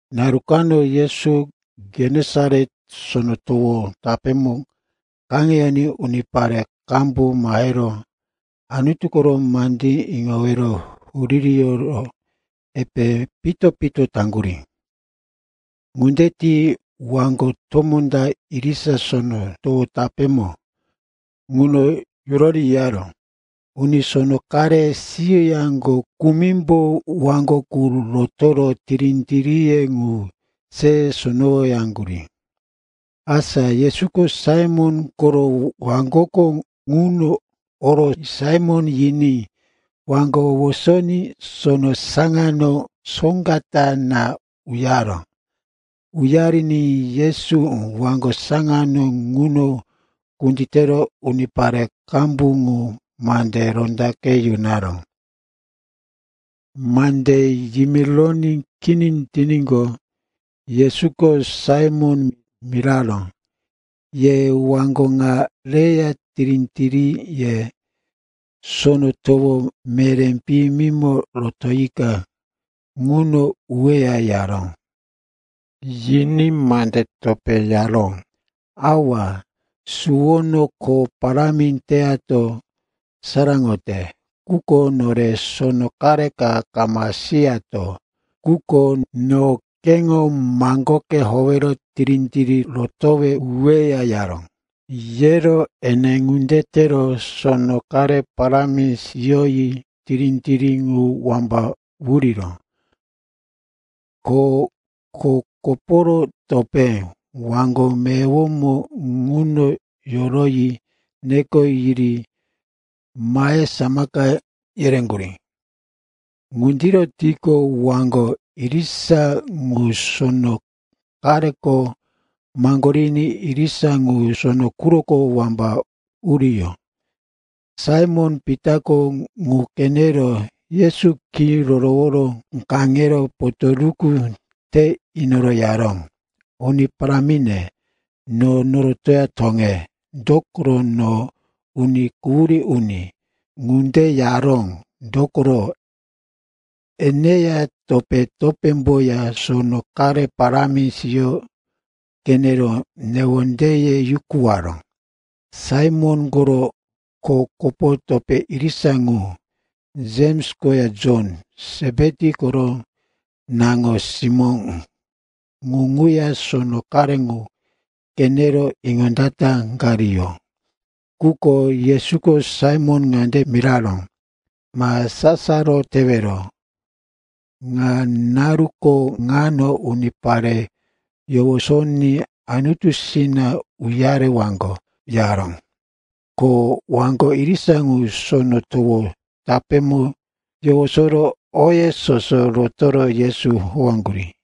Naru kano Yesu Genesaret Sono Towo tapémo kaŋeyoní unipare qambu mahero Anutu koro mande iŋowero wuririyoro epe pito-pito taŋgurí. Ŋunde ti waŋgo tomó ta irisa sono towo tapémo ŋuno yorori yiyaró. Uni sono qare siyoyaŋgo kumimbo waŋgo ŋu rotoro tirí-tiríye ŋu se sonowoyaŋgurí. Asa Yesuko Saimon koro waŋgoko ŋuno oro Saimon yiní waŋgo wosoní sono saŋano soŋga ta na uyaró. Uyariní Yesu waŋgo saŋano ŋuno kunditero unipare qambu ŋu mande rondaqe yunaró. Mande yimironí kini tiníqo, Yesuko Saimon miraró, “Ye waŋgo ŋa reya tirí-tiríye sono towo meré piyimimo rotoyika ŋuno uweya,” yaró. Yiní mande topé yaró, “Awa, suwono kho parámi teyato saraŋote, quko nore sono qare ka kama siyato. Quko no keŋo maŋgoke howero tirí-tirí rotowe uweya,” yaró. Yero ene ŋunde tero sono qare parámi siyoyi tirí-tirí ŋu wamba wuriró. Ko kho kopo topé waŋgo meyowomo ŋuno yoroyi neko yiri mahe samaka yereŋgurí. Ŋundiro tiqo, waŋgo irisa ŋu sono qareko maŋgoriní irisa ŋu sono quroko wamba uriyó. Saimon-Pitako ŋu qenero Yesu khí rorowo kaŋero potoruku te inoro yaró, “Uni Parámi, no norotoya toŋe, dokoro no uni quhurí uni.” Ŋunde yaró, dokoro eneya topé-topémboya sono qare parámi siyo qenero newondeye yukuwaró. Saimon koro kho kopo topé irisa ŋu, Jems koya Jon, Sepeti koro naŋo-simó, ŋu ŋuya sono qare ŋu qenero iŋondataqariyó. Quko Yesuko Saimon ŋande miraró, “Ma sasaro tewero. Ŋa naruko ŋano unipare yowosoní Anutusina uyarewaŋgo,” yaró. Ko waŋgo irisa ŋu sono towo tapémo yowosoro oye soso rotoro Yesu howaŋgurí.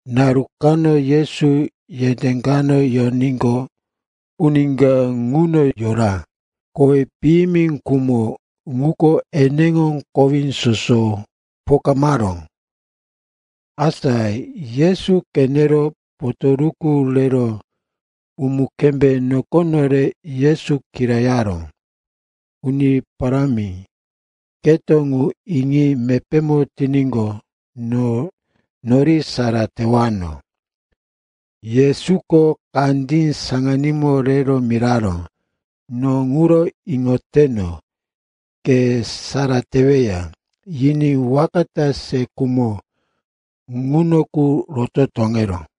Naru kano Yesu yendé kano yoníqo, uni ka ŋuno yora, kowí piyimi khumo ŋuko eneŋo kowí soso pokamaró. Asa Yesu qenero, potoruku rero umu-kembé nokono rero Yesu kirayaró, “Uni Parámi, keto ŋu iŋi mepémo tiníqo, no nori sara tewano.” Yesuko kandí saŋanímo rero miraró, “No ŋuro iŋoteno. Ke sara teweya.” Yiní waka ta se khumo ŋuno qu roto toŋeró.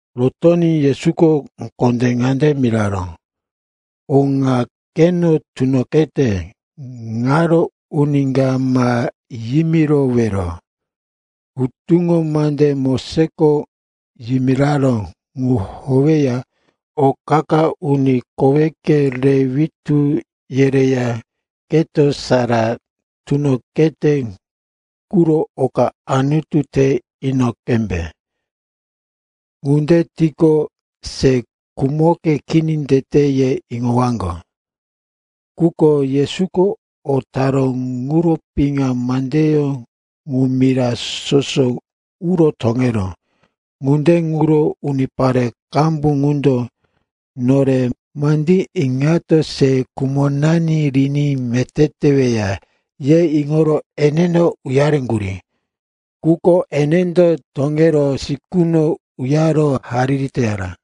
Rotoní Yesuko kondé ŋande miraró, “O ŋa keno tunoqete ŋaro uni ka ma yimirowero. Hutuŋo mande Mosesko yimiraró ŋu howeya o qa-qa uni koweke re witú yereya keto sara tunoqete quro oka Anutu te ino qembe. Ŋunde tiqo, se khumoke kini tete, ye iŋowaŋgo.” Quko Yesuko o taró ŋuro piŋa mandeyó ŋu mira soso uro toŋeró. Ŋunde ŋuro unipare qambu qundo, nore mandí iŋato se khumonani riní meté teweya, ye iŋoro eneno uyareŋgurí. Quko enendo toŋero sikuno uyaro hariri teyara.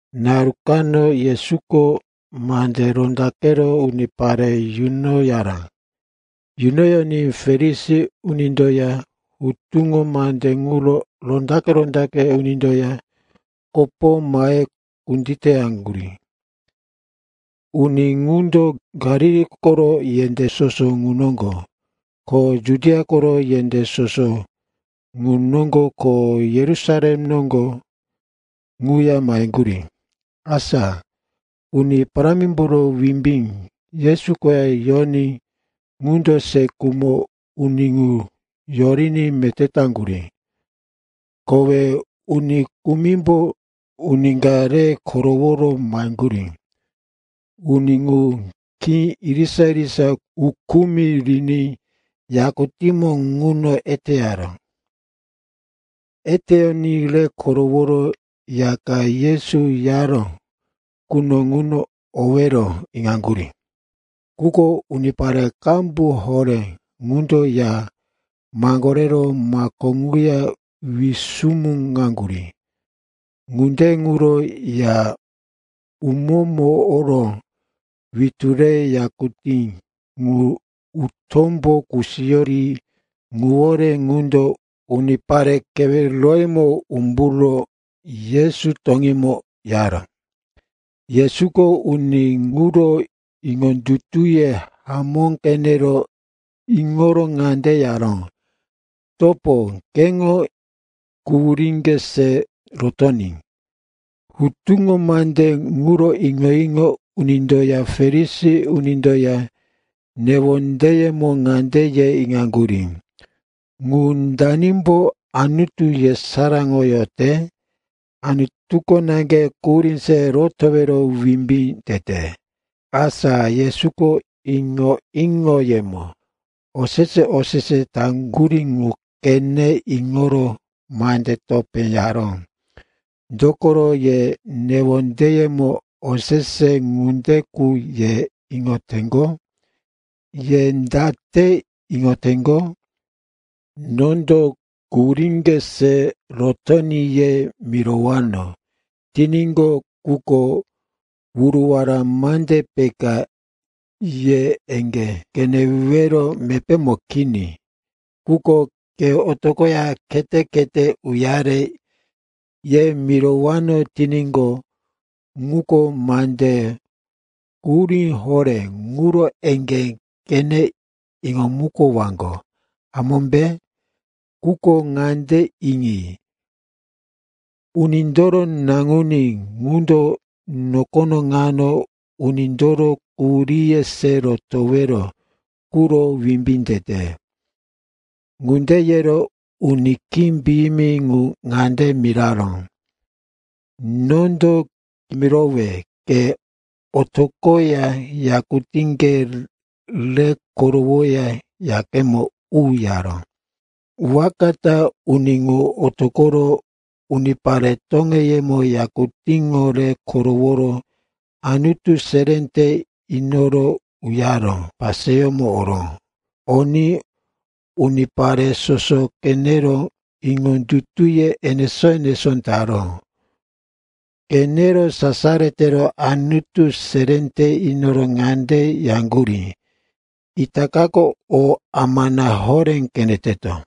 Naru kano Yesuko mande rondaqero unipare yunoyaró. Yunoní Farisi unindoya hutuŋo mande ŋuro rondaqe-rondaqe unindoya kopo mahe kunditeyaŋgurí. Uni ŋundo Galili koro yendé soso ŋu noŋgo, ko Judia koro yendé soso ŋu noŋgo ko Yerusalem noŋgo ŋuya maheŋgurí. Asa Uni Parámimboro wimbí Yesu koya yoní ŋundo se khumo uni ŋu yoriní meté taŋgurí. Kowe uni kumimbo uni ka re koroworo maheŋgurí. Uni ŋu khí irisa-irisa ukumi riní yakutímo ŋuno eteyaró. Eteyoní re koroworo ya ka Yesu yaró quno ŋuno owero iŋaŋgurí. Quko unipare qambu horé ŋundo ya maŋgorero mako ŋuya wisumuŋaŋgurí. Ŋunde ŋuro ya umómo oro witú rero yakutí ŋu utómbo kusiyo ri ŋuwore ŋundo unipare keweroyemo umburo Yesu toŋímo yaró. Yesuko uni ŋuro iŋondutuye hamó qenero iŋoro ŋande yaró, “Topo, keŋo quhuríŋge se rotoní.” Hutuŋo mande ŋuro iŋo-iŋo unindoya Farisi unindoya newondeyemo ŋande yero iŋaŋgurí, “Ŋu danimbo Anutu yesaráŋoyote? Anutuko naŋge quhurí se rotowero wimbí tete.” Asa Yesuko iŋo-iŋoyemo osese-osese taŋgurí ŋu qene iŋoro mande topé yaró, “Dokoro ye newondeyemo osese ŋunde qu ye iŋoteŋgo? Ye date iŋoteŋgo? Nondo, ‘Quhuríŋge se rotoní,’ ye mirowano tiníqo, ŋuko wuruwara mande peka, ye eŋgé qenewero mepémo kini. Quko, ‘Ke otoqoya khete-khete uyare,’ ye mirowano tiníqo, ŋuko mande quhurí horé, ŋuro eŋgé qene iŋomukowaŋgo, hamómbe? Quko ŋande iŋi, Unindoro Naŋuní ŋundo nokono ŋano unindoro quhuríye se rotowero quro wimbí tete.” Ŋunde yero uni khí piyimi ŋu ŋande miraró, “Nondo kimirowe, ke otoqoya yakutíŋge re korowoya yakemo u,” yaró. Waka ta uni ŋu otoqoro unipare toŋeyemo yakutíŋo re koroworo Anutu seré te inoro uyaro paseyómo oró. Oní unipare soso qenero iŋondutuye enesó-enesó taró. Qenero sasaro tero Anutu seré te inoro ŋande yaŋgurí, “Itaka o amana horé qeneteto.”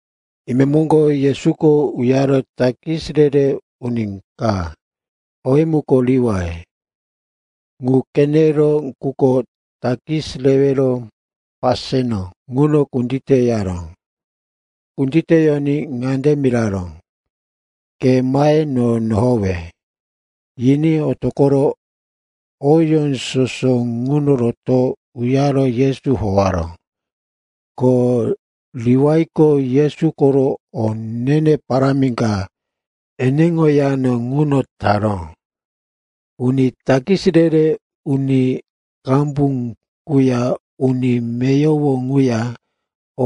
Imemoŋgo Yesuko uyaro takis re-re uni ka, owí muko Liwai, ŋu qeneró quko takis rewero paseno ŋuno kunditeyaró. Kunditeyoní ŋande miraró, “Ke mahe no nohowe.” Yiní otoqoro oyó soso ŋuno rotoro uyaro Yesu howaró. Ko Liwaiko Yesu koro o ne-ne parámi ka eneŋo yano ŋuno taró. Uni takis re-re uni qambu quya uni meyowo ŋuya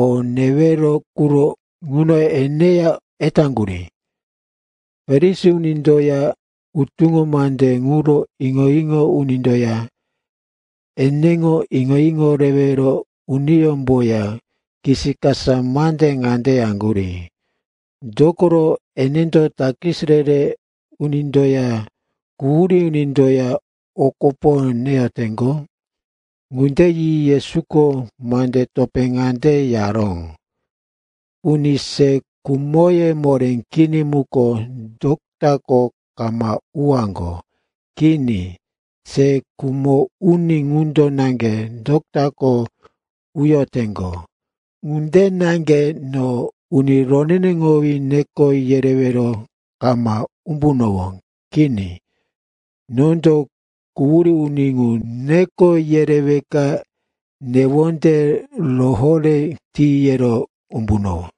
o newero quro ŋuno eneya etaŋgurí. Farisi unindoya hutuŋo mande ŋuro iŋo-iŋo unindoya eneŋo iŋo-iŋo rewero uniyómboya kisikasa mande ŋande yaŋgurí, “Dokoro enendo takis re-re unindoya quhurí unindoya o kopo neyoteŋgo?” Ŋunde yi Yesuko mande topé ŋande yaró, “Uni se khumoye moré kini muko dotako kama uwaŋgo. Kini. Se khumo uni ŋundo naŋge dotako uyoteŋgo. Ŋunde naŋge no uni roneneŋowí neko yerewero kama umbunowó. Kini. Nondo quhurí uni ŋu neko yereweka newonde rohoré ti yero umbunowó.”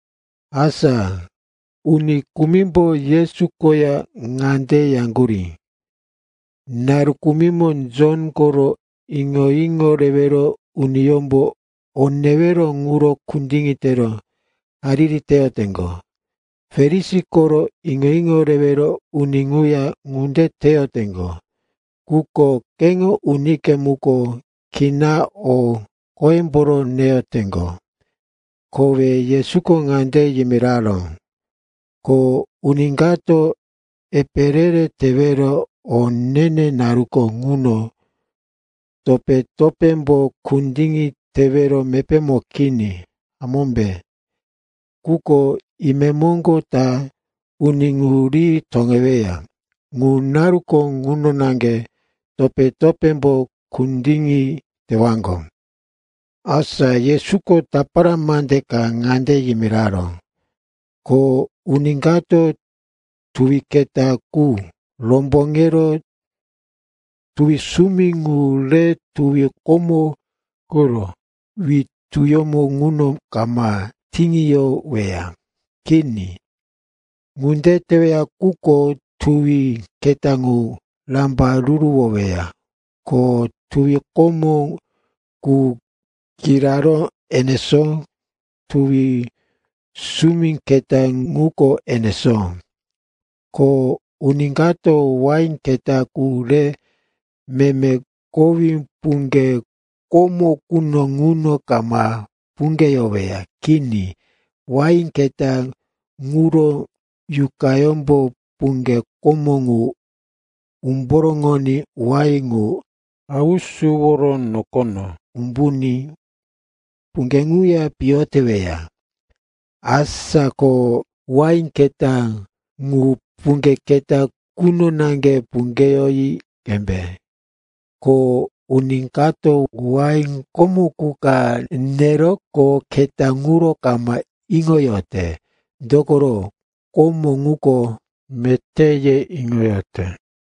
Asa uni kumimbo Yesu koya ŋande yaŋgurí, “Naru kumimo Jon koro iŋo-iŋo rewero uniyómbo o newero ŋuro kundiŋi tero hariri teyoteŋgo. Farisi koro iŋo-iŋo rewero uni ŋuya ŋunde teyoteŋgo. Quko keŋo unike muko kinaŋge o qoyemboro neyoteŋgo.” Kowe Yesuko ŋande yimiraró, “Ko uni kato epe re-re tewero o ne-ne naruko ŋuno topé-topémbo kundiŋi tewero mepémo kini, hamómbe? Quko imemoŋgo ta uni ŋu ri toŋeweya. Ŋu naruko ŋuno naŋge topé-topémbo kundiŋi tewaŋgo.” Asa Yesuko tapara mande ka ŋande yimiraró, “Ko uni kato tuwi keta qu romboŋero tuwi sumi ŋu rero tuwi komo quro wituyómo ŋuno kama tiŋiyoweya. Kini, ŋunde teweya quko tuwi keta ŋu rambaruruwoweya, ko tuwi komo ŋu kiraró enesó, tuwi sumi keta ŋuko enesó. Ko uni kato wain keta qu re meme kowí puŋge komo quno ŋuno kama puŋgeyoweya. Kini, wain keta ŋuro yuqayómbo puŋge komo ŋu umboroŋoní wain ŋu hausuworo nokono umbuní puŋge ŋuya piyo teweya. Asa ko wain keta qu puŋge keta quno naŋge puŋgeyoyi qembe. Ko uni kato wain komo qu ka neroqo keta quro kama iŋoyote, dokoro, ‘Komo ŋuko meté,’ ye iŋoyote.”